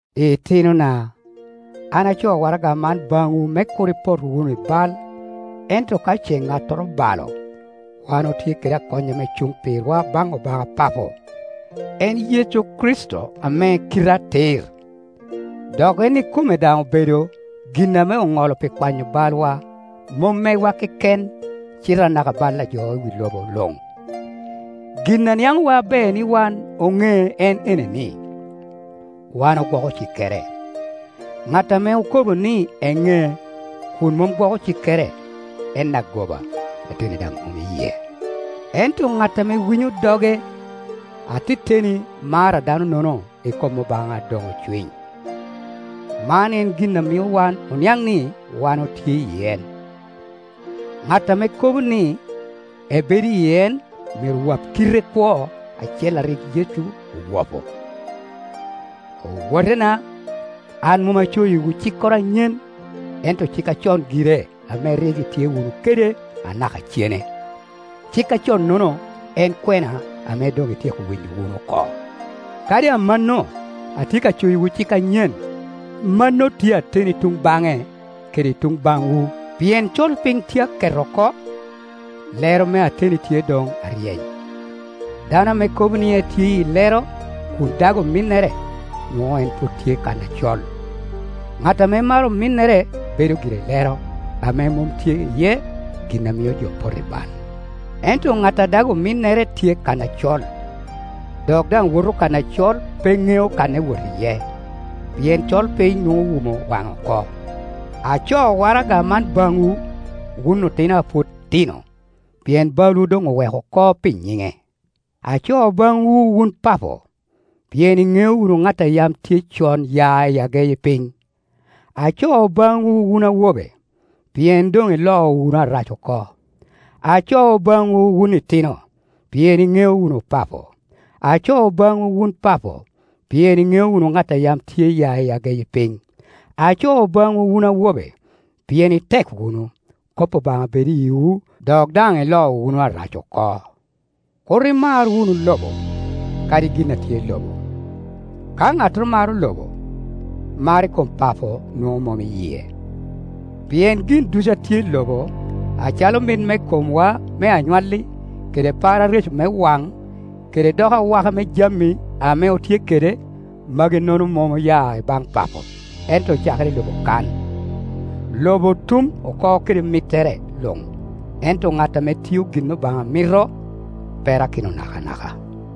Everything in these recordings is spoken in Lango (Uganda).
Itinona, an acoo waraga man baŋwu me kur ipot wunu i bal; ento ka ce ŋattoro obalo, wan otye kede akony ame cuŋ pirwa baŋ Obaŋa Papo, en Yecu Kricito ame kite atir. Dok en ikome daŋ obedo gin ame oŋolo pi kwanyo balwa; mom megwa keken cite anaka bal a jo i wi lobo luŋ. Gin a niaŋowa aber ni wan oŋee en ene ni, wan ogwoko cikkere. Ŋat ame okobo ni eŋee, kun mom gwoko cikkere, en agoba, ateni daŋ mom i yie. Ento ŋat ame winyo doge, ateteni mar a dano-nono i kom Obaŋa doŋ ocwiny. Man en gin a mio wan oniaŋ ni wan otye i en: Ŋat ame kobo ni ebedo i en myero wap kite kwo acel a rik Yecu owapo. Owotena, an mom acoyiwu cikkoro anyen, ento cik acon gire ame rik itye wunu kede anaka cene. Cik aconnono en kwena ame doŋ ityeko winyo wunu oko. Kadi amanno, atye ka coyiwu cik anyen; mano tye ateni i tuŋ baŋe kede i tuŋ baŋwu, pien colpiny tye a ket oko, lero me ateni tye doŋ aryeny. Dano ame kobo ni etye i lero kun dago ominnere, nwoŋo en pwod tye kan acol. Ŋat ame maro ominnere bedo gire i lero, ame mom tye iye gin a mio jo poto i bal. Ento ŋat a dag ominnere tye kan acol, dok daŋ woto kan acol; pe ŋeo kan ewot iye, pien colpiny nwoŋo owumo waŋe oko. Acoo waraga man baŋwu, wun otino a pwod tino, pien balwu doŋ oweko oko pi nyiŋe. Acoo baŋwu wun papo, pien iŋeo wunu ŋat a yam tye con ya i ageyi piny. Acoo baŋwu wun awobe, pien doŋ iloo wunu Arac oko. Acoo baŋwu wun itino, pien iŋeo wunu Papo. Acoo baŋwu wun papo, pien iŋeo wunu ŋat a yam tye ya i ageyi piny. Acoo baŋwu wun awobe, pien itek wunu, kop Obaŋa bedo i yiwu, dok daŋ iloo wunu Arac oko. Kur imar wunu lobo, kadi gin a tye i lobo. Ka ŋattoro maro lobo, mar i kom Papo nwoŋo mom i yie. Pien gin ducu a tye i lobo, acalo mit me komwa me anywalli, kede par areco me waŋ, kede dok awaka me jami ame otye kede, magi-nono mom oya i baŋ Papo, ento ocakere i lobo kan. Lobo tum oko kede mittere luŋ; ento ŋat ame tio gin ame Obaŋa mito perakino nakanaka.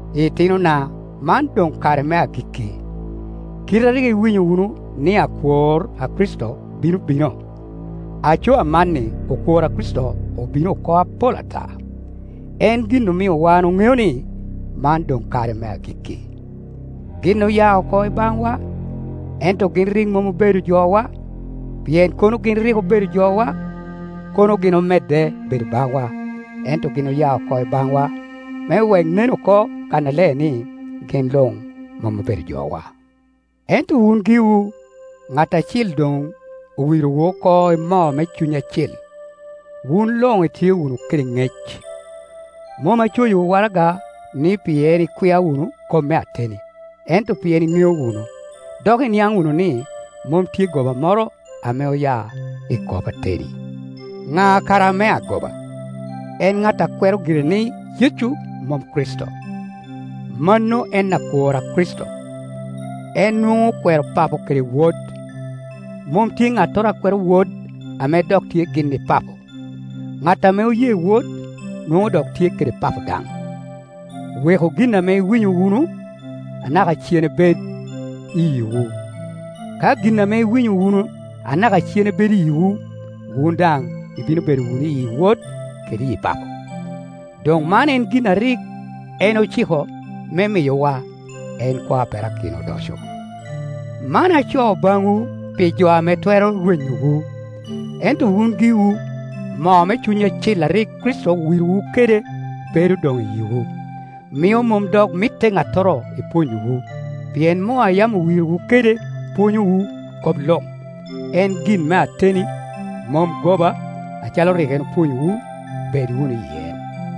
Itinona, man doŋ kare me agikki. Kite a rik iwinyo wunu ni, akwor a Kricito bino bino, aco amanni okwor a Kricito obino oko apol ata; en gin omio wan oŋeo ni, man doŋ kare me agikki. Gin oya oko i baŋwa, ento gin rik mom obedo jowa; pien kono rik gin obedo jowa, kono gin omedde bedo baŋwa. Ento gin oya oko i baŋwa me wek nen oko kannaler ni gin luŋ mom obedo jowa. Ento wun giwu, ŋat Acil doŋ owirowu oko i moo me Cuny Acil, wun luŋ itye wunu kede ŋec. Mom acoyiwu waraga-ni pien ikwia wunu kop me ateni, ento pien iŋeo wunu, dok iniaŋ wunu ni, mom tye goba moro ame oya i kop ateni. Ŋa kara ame agoba? En ŋat a kwero gire ni Yecu mom Kricito. Mano en akwor a Kricito, en nwoŋo okwero Papo kede Wod. Mom tye ŋattoro a kwero Wod ame dok tye gin i Papo. Ŋat ame oye Wod, nwoŋo dok tye kede Papo daŋ. Weku gin ame iwinyo wunu anaka cene bed i yiwu. Ka gin ame iwinyo wunu anaka cene bedo i yiwu, wun daŋ ibino bedo wunu iyi Wod kede iyi Papo. Doŋ man en gin a rik en ociko me miyowa, en kwo a perakino odoco. Man acoo baŋwu pi jo ame twero rwenyowu. Ento wun giwu, moo me Cuny Acil a rik Kricito owirowu kede bedo doŋ i yiwu, mio mom dok mitte ŋattoro ipwonyowu; pien moo a yam owirowu kede pwonyowu kop luŋ. En gin me ateni, mom goba; acalo rik en opwonyowu, bed wunu i en.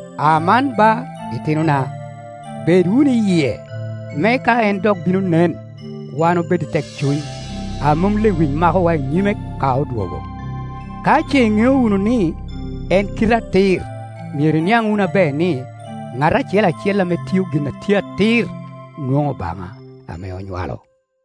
Aman ba, itinona, bed wunu i yie, me ka en dok bino nen, wan obed i tekcuny, a mom lewic makowa I nyime ka odwogo. Ka ce iŋeo wunu ni, en kite atir, myero iniaŋ wunu aber ni, ŋat acel acel ame tio gin a tye atir nwoŋo Obaŋa ame onywalo.